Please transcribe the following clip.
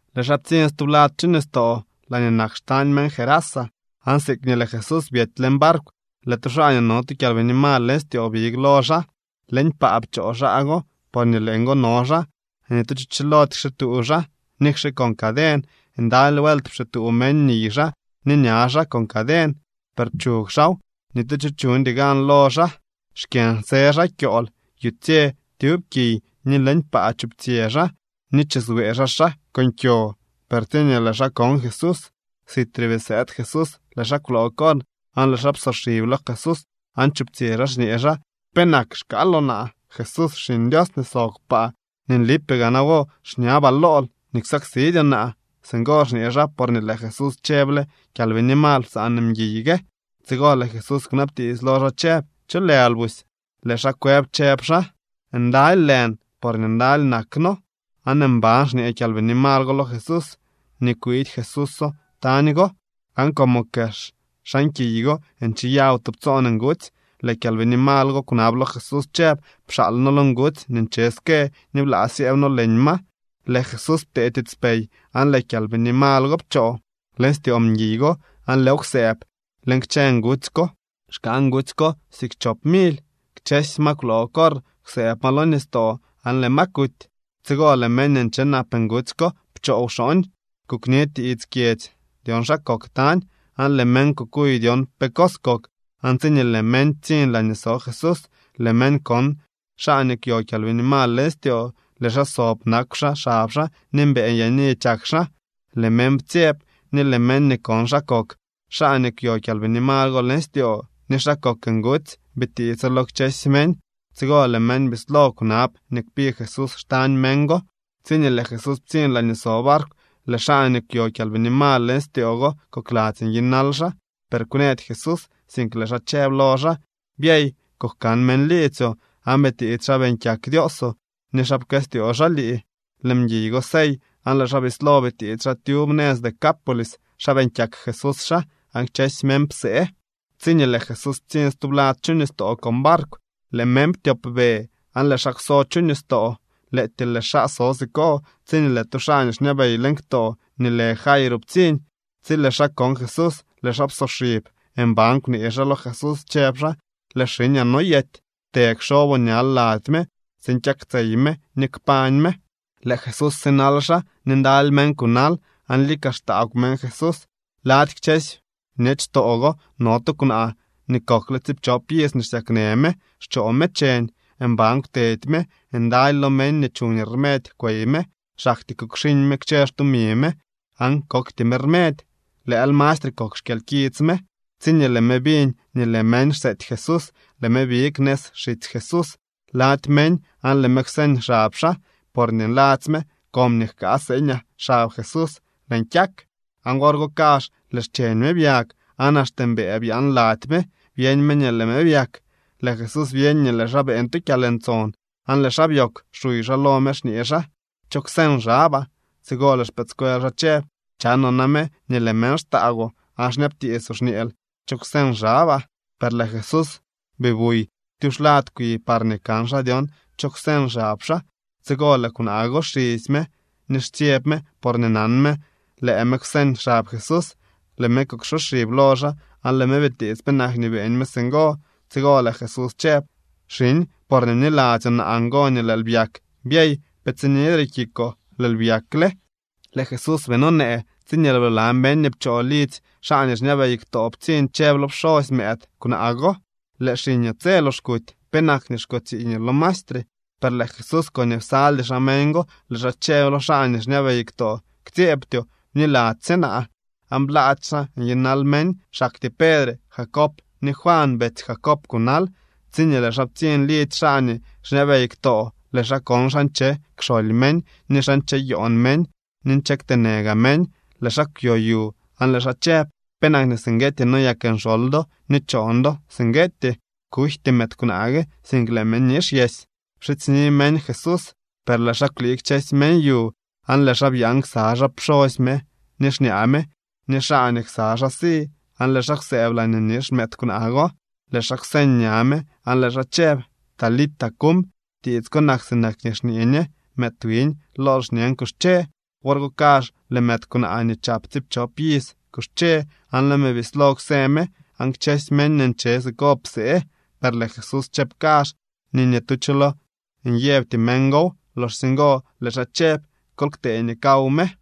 Lëë xaa ptsiñ stublad chu nistoo laañee nak xtañ meñ Gerasa. Aan siikñee lëë Jesús byedy leñ barkw, lëë tu xaa nii no tu kyalbini mal leñ styoo big lo xaa. Leñ paa pchoo xaa go porñee leeñgo no xaa. Ni tu cho chilody kxituu xaa nikxe con caden. Ndaly vuelt pxituu meñ niy xaa ni ña xaa con caden, per pchug xaaw. Ni tu cho chuñdy gan lo xaa. Xkyënsë xaa kyool yutsye tyub kiy ni leñ paa chuptsyë xaa ni chiswee xaa xaa con kyo. Per tsiñee lëë xaa kon Jesús, sitre bii sëëd Jesús, lëë xaa kwloo corr aan lëë xaa psoxib lo Jesús aan chuptsyë xaa xñee xaa: —¿Penak xkaaloo naa, Jesús Xiñ Dios nii sob kpaa? Ni nlipee gaa nawo xñabaa lool nii ksaksidyoo naa. Singo xñee xaa porñee lëë Jesús chëble: —¡Kyalbini mal, psaan mguiy gue! Tsigo lëë Jesús kwnabtiits lo xaa chëb: —¿Cho lël busy? Lëë xaa kwëb chëb xaa: —Ndaly lën porñee ndaly nak noo. Aan mban xñee kyalbini mal go lo Jesús nii kwiidy Jesúso tañ go. Aan como kex xan kiy go ncheyaw tubtsoon ngutsy, lëë kyalbini mal go kwnab lo Jesús chëb: —Pxaal noo lo ngutsy nii nche ske ni blaa syëëb noo leñ ma. Lëë Jesús ptee tiitspey, aan lëë kyalbini mal go pchoo leñ styoo mguiy go aan lëëw kwsëëb leñ kchë ngutsy ko. Xkaa ngutsy ko siik chop mily. Kchësy ma kwloo corr kwsëëb ma lo nistoo aan lëë ma kuty. Tsigo lëë meñ nii nche nap ngutsy ko pchoo wxooñ kukni tiits kyedzy dyon xa kok tañ. Aan lëë meñ kukuy dyon pe cos kok. Aan tsiñee lëë meñ ptsiñ laañee so Jesús, lëë meñ kon xaa nii kwyo kyalbini mal styoo. Lëë xaa sob, nakw xab xaa ni mbëë nyaani chak xaa. Lëë meñ ptsyeb, ni lëë meñ nii kon xa kok xaa nii kwyo kyalbini mal go leñ styoo ni xa kok ngutsy, bitiitso lo kchësy meñ. Tsigo lëë meñ bislo kwnab nii kpi Jesús xtañ meñ go. Tsiñee lëë Jesús ptsiñ laañee so barkw, lëë xaa nii kwyo kyalbini mal styoo go kokladzy nyinal xaa. Per kwnëdy Jesús, sink lëë xaa chëb lo xaa: —Byey, kujkan meñ liidzyoo, aan bitiits xa beeñ kyak Dioosoo, ni xa pkëstyoo xaa lii. Lëë mguiy go sey, aan lëë xaa bislo bitiits xaa tyub nëz Decápolis xa beeñ kyak Jesús xaa. Aan kchësy meñ psee. Tsiñee lëë Jesús ptsiñ stublad chu nistoo con barkw, lëë meñ ptyopbe aan lëë xaa kwso chu nistoo. Lëëtyee lëë xaa so siko tsiñee lëë tu xaa nii xñabey leñ ktoo nii lë Jairo ptsiñ. Tsi lëë xaa kon Jesús, lëë xaa psoxib aan mban kwnee xaa lo Jesús chëb xaa: —Lëë xiñaa noyety. Të kxoboo ñal lady me tsiin kyaktsey me ni kpañ me. Lëë Jesús sinal xaa ni ndaly meñ kunal, aan lika xtaagw meñ Jesús. Lady kchësy bñechtoo go no tu kwnaa nii kokle tsiipchop iz xsyaknë me, xchoo me cheñ. Mban kwtedy me. Ndaly lo meñ nii chuñ rmedy kwey me. Xaktyee kukxiñ me kchë xtumi me aan kokty me rmedy. Lëël mastre kok xkyalkits me. Tsiñee lëë me biñ nii lëë meñ xseety Jesús, lëë me big nëz xitsy Jesús lady meñ aan lëë me kwseñ xab xaa. Porñee nladzy me: “Comñee jkaa seeñaa xab Jesús lëën kyak.” Aan wor go kazh lëë xcheñ me byag. Aan axte mbëë byaan lady me byeñ me nii lëë me byak. Lëë Jesús byeñ nii lëë xaa beeñ tu kyalntson, aan lëë xaa byoogw xuy xaa lo meñ xñee xaa: —¿Cho kwseñ xabaa? Tsigo lëë xpëëdscuel xaa chëb: —Chanoo name nii lëë meñ xtaagwoo aan xñabtiitsoo, xñeel: “¿Cho kwseñ xabaa?” Per lëë Jesús bii buy tyuxlad kwi parñee kan xaa dyon cho kwseñ xab xaa. Tsigo lëë kwnaa go xisy me ni xtsyeb me porñee nan me lëë me kwseñ xab Jesús. Lëë me kuksoxib lo xaa aan lëë me bitiits penak nii beeñ me singo. Tsigo lëë Jesús chëb: —Xiñ, porñee bniladzyoo naa ngo nii lëël byak. Byey. Pe tsinidre kikoo. Lëël byakle. Lëë Jesús bii nonee tsiñee lëë bla meñ nii pchoo lidzy xaa nii xñabey ktoo ptsiñ chëb lo pxosy mëëd kwnaa go: —Lëë xiñoo tse lox kuty. ¿Penak nii xko tsiiñoo lo maestre? Per lëë Jesús koñee psaldy xaa meñ go lëë xaa chëb lo xaa nii xñabey ktoo: —Ktsyeebtyoo. Bniladzy sye naa. Aan blaady xaa nyinal meñ. Xaktyee Pedre, Jacob ni Juan, betsy Jacob kunal. Tsiñee lëë xaa ptsiñ lidzy xaa nii xñabey ktoo, lëë xaa kon xa nche kxoly meñ ni xa ncheyoon meñ ni nche kteenë gaa meñ. Lëë xaa kwyo yu aan lëë xaa chëb: —¿Penak singueetyee noyak nxoly do ni choon do singueetyee? Kujty mëëd kwnaa gue, sink lëë me nixyesy. Pxidzyni meñ Jesús, per lëë xaa kwlii kchësy meñ yu. Aan lëë xaa byaan ksa xaa pxosy me ni xñaa me ni xaa nii ksa xaa si. Aan lëë xaa kwsëëb laañee nix mëëd kwnaa go. Lëë xaa kwseñ ña me aan lëë xaa chëb: —Talita, cum. (Tiits ko nak sinak nii xñee ñe: Mëëd wiñ, lool xñen, kuxche.) Wor go kazh lëë mëëd kwnaa nii chap tsiipchop iz kuxche aan lëë me bislo kwsë me. Aan kchësy meñ nii nche siko psee. Per lëë Jesús chëb kazh nii ni tu cho lo nyëbty meñ gow. Loxsye ngo lëë xaa chëb: —Kol ktee nii kaw me.